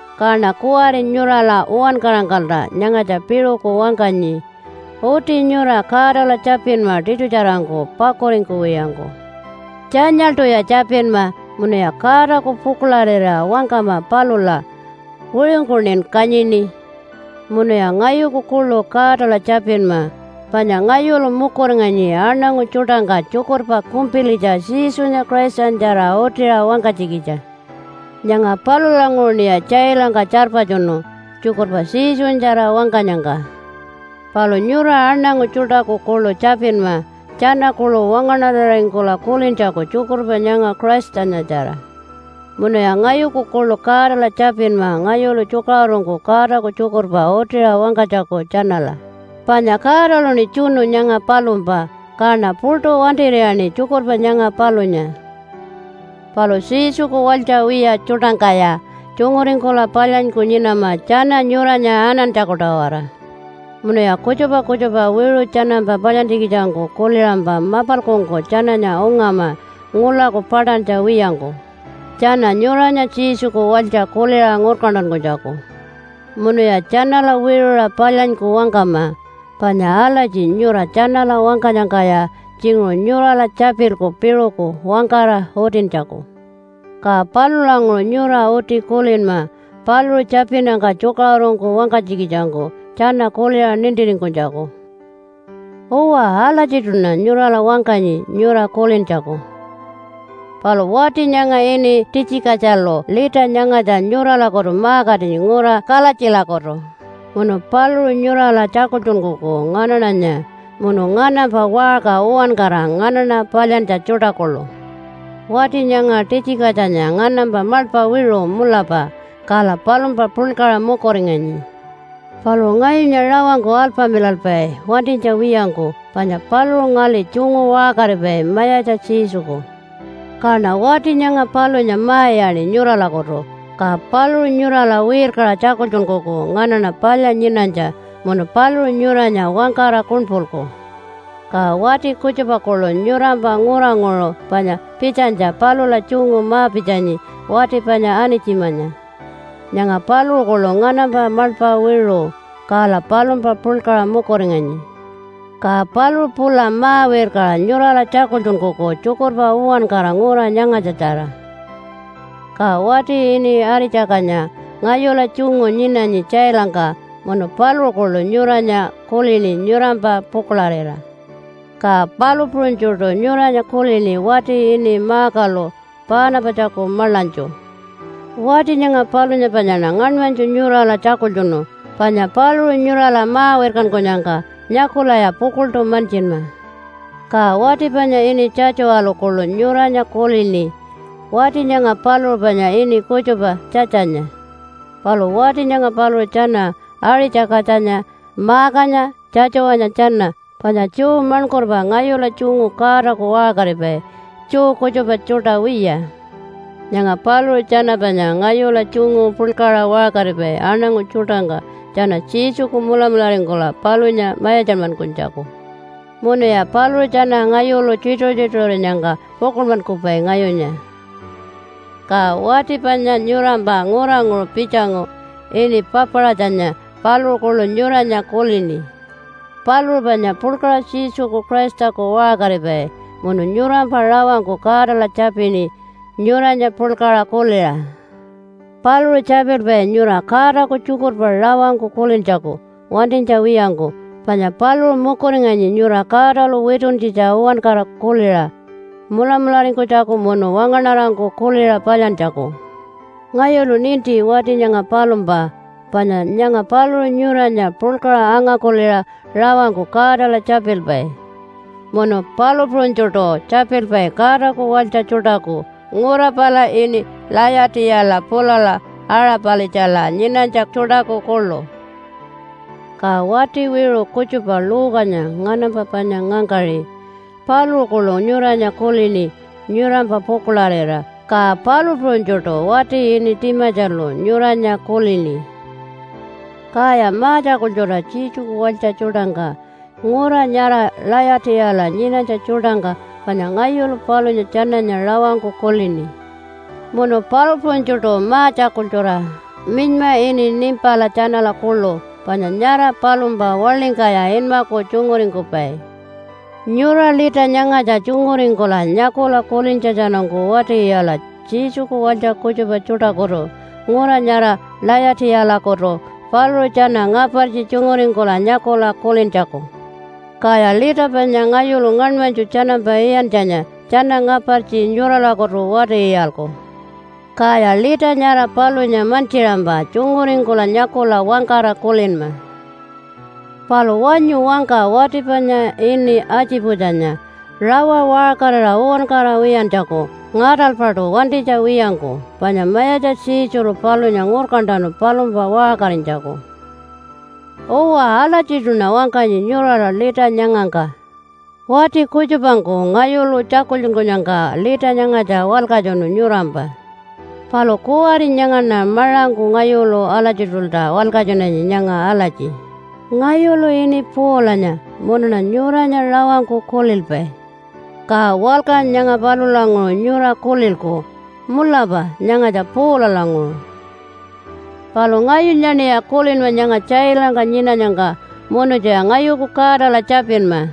Kaṉa kuwari nyurala uwankarangkalta nyangatja piṟuku wangkanyi. Uti nyura Godala tjapinma tiṯutjarangku pakuringkuwiyangku. Tjanyaḻṯuya tjapinma, munuya Godaku pukuḻarira wangkama palula, “Wiṟungkuṉin kanyini!” Munuya ngayuku kuḻu Godala tjapinma, panya ngayulu mukuringanyi aṉangu tjuṯangka tjukurpa kumpilitja Jesunya Christanyatjara utiṟa wangkanytjikitja. Nyanga palulanguṟuṉiya tjailangka tjarpatjunu, tjukurpa Jesunyatjara wangkanyangka. Palu nyura aṉangu tjuṯaku kuḻu tjapinma tjana kuḻu wangaṉararingkula kulintjaku tjukurpa nyanga Christanyatjara. Munuya ngayuku kuḻu Godala tjapinma ngayulu tjukaṟurungku Godaku tjukurpa utiṟa wangkanytjaku tjanala, panya Godaluṉi tjunu nyanga palumpa, kaṉa puṯu wantir'iyaṉi tjukurpa nyanga palunya. Palu Jesuku walytja wiya tjuṯangkaya tjunguringkula palyanyku nyinama tjana nyuranya anantjaku-tawara. Munuya kutjupa kutjupa wiṟu tjanampa palyantjikitjangku kuliṟampa mapalkungku tjananya ungama ngulaku paṯantja wiyangku, tjana nyuranya Jesuku walytja kuliṟa ngurkantankunytjaku. Munuya tjanala wiṟuṟa palyanyku wangkama. Panya alatji nyura tjanala wangkanyangkaya tjinguṟu nyurala tjapilku piṟuku wangkara utintjaku, ka palulanguṟu nyura uti kulinma paluṟu tjapinnyangka tjukaṟurungku wangkanytjikitjangku tjana kuliṟa nintiringkunytjaku. Uwa alatjiṯuṉa nyurala wangkanyi nyura kulintjaku. Palu wati nyanga ini Titjikatjalu lita nyangatja nyuralakutu ma-katinyi ngura Kalatjilakutu, munu paluṟu nyurala tjakultjunkuku nganaṉanya, munu nganampa waṟka uwankara nganaṉa palyantja tjuṯa kuḻu. Wati nyanga Titjikatjanya nganampa maḻpa wiṟu mulapa, kala palumpa puḻkaṟa mukuringanyi. Paluṟu ngayunya rawangku alpamilalpai wantinytja wiyangku, panya paluṟu ngali tjungu waṟkaripai Mayatja Jesuku. Kaṉa wati nyanga palunya ma-iyaṉi nyuralakutu, ka paluṟu nyurala wirkaṟa tjakultjunkuku nganaṉa palya nyinanytja, munu paluṟu nyuranya wangkara kuṉpulku. Ka wati kutjupa kuḻu nyurampa nguranguṟu panya pitjanytja palula tjungu ma-pitjanyi wati panya Anitjimanya. Nyanga paluṟu kuḻu nganampa maḻpa wiṟu, kala palumpa puḻkaṟa mukuringanyi. Ka paluṟu pula ma-wirkaṟa nyurala tjakultjunkuku tjukurpa uwankara ngura nyangatjatjara. Ka wati ini Aṟi-tjakatjanya ngayula tjungu nyinanyi tjailangka, munu paluṟu kuḻu nyuranya kulini nyurampa pukuḻarira. Ka palu puṟunytjuṯu nyuranya kulini wati ini Markalu Paanapatjaku maḻanytju. Wati nyanga palunya panyaṉa ngaṉmanytju nyurala tjakultjunu panya paluṟu nyurala ma-wirkankunyangka nyakulaya pukuḻṯu mantjinma. Ka wati panya ini Tjatjuwalu kuḻu nyuranya kulini. Wati nyanga paluṟu panya ini kutjupa Tjatjanya. Palu wati nyanga paluṟu tjana, Aṟi-tjakatjanya, Markanya, Tjatjuwanya tjana panya Jew maṉkurpa ngayula tjungu Godaku waṟkaripai, Jew kutjupa tjuṯa wiya. Nyanga paluṟu tjana panya ngayula tjungu puḻkaṟa waṟkaripai aṉangu tjuṯangka tjana Jesuku mulamularingkula palunya mayatjanmankunytjaku. Munuya paluṟu tjana ngayulu tjituṟu-tjituṟurinyangka pukuḻmankupai ngayunya. Ka wati panya nyurampa nguranguṟu pitjangu ini Papaṟatjanya, paluṟu kuḻu nyuranya kulini. Paluṟu panya puḻkaṟa Jesuku Christaku waṟkaripai munu nyurampa rawangku Godala tjapini nyuranya puḻkaṟa kuliṟa. Paluṟu tjapilpai nyura Godaku tjukurpa rawangku kulintjaku wantinytja wiyangku, panya paluṟu mukuringanyi nyura Godalu wituntjitja uwankara kuliṟa mulamularingkunytjaku munu wangaṉarangku kuliṟa palyantjaku. Ngayulu ninti wati nyanga palumpa panya nyanga paluṟu nyuranya puḻkaṟa anga-kuliṟa rawangku Godala tjapilpai munu palu puṟunytjuṯu tjapilpai Godaku walytja tjuṯaku ngura pala ini Layatiyala pulala Aṟa-palitjala nyinanytja tjuṯaku kuḻu. Ka wati wiṟu kutjupa Luke-anya nganampa panya ngangkaṟi, paluṟu kuḻu nyuranya kulini nyurampa pukuḻarira. Ka palu puṟunytjuṯu wati ini Timatjalu nyuranya kulini. Kaya ma-tjakultjura Jesuku walytja tjuṯangka ngura nyara Layatiyala nyinanytja tjuṯangka panya ngayulu palunya tjananya rawangku kulini. Munu palu puṟunytjuṯu ma-tjakultjura minyma ini Nimpala tjanala kuḻu panya nyara palumpa waḻingkaya inmaku tjunguringkupai. Nyura lita nyangatja tjunguringkula nyakula kulintjatjanungku wati-iyala Jesuku walytja kutjupa tjuṯakutu ngura nyara Layatiyalakutu paluṟu tjana ngapartji tjunguringkula nyakula kulintjaku. Kaya lita panya ngayulu ngaṉmanytju tjanampa iyantjanya tjana ngapartji nyuralakutu wati-iyalku. Kaya lita nyara palunya mantjiṟampa tjunguringkula nyakula wangkara kulinma! Palu wanyu wangka wati panya ini Atjiputjanya rawa waṟkarira uwankara wiyantjaku ngaṯalpaṯu wantinytja wiyangku, panya Mayatja Jesulu palunya ngurkantanu palumpa waṟkarinytjaku. Uwa, alatjiṯuṉa wangkanyi nyurala lita nyangangka. Wati kutjupangku ngayulu tjakultjunkunyangka lita nyangatja walkatjunu nyurampa, palu kuwari nyangaṉa maṟangku ngayulu alatjiṯulta walkatjunanyi nyanga alatji, “Ngayulu ini Paulanya munuṉa nyuranya rawangku kulilpai.” Ka walka nyanga palulanguṟu nyura kulilku, “Mulapa nyangatja Paulalanguṟu.” Palu ngayunyaṉiya kulinma nyanga tjailangka nyinanyangka munutjuya ngayuku Godala tjapinma.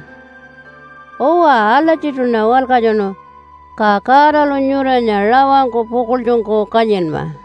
Uwa, alatjiṯuṉa walkatjunu. Ka Godalu nyuranya rawangku pukuḻtjungku kanyinma.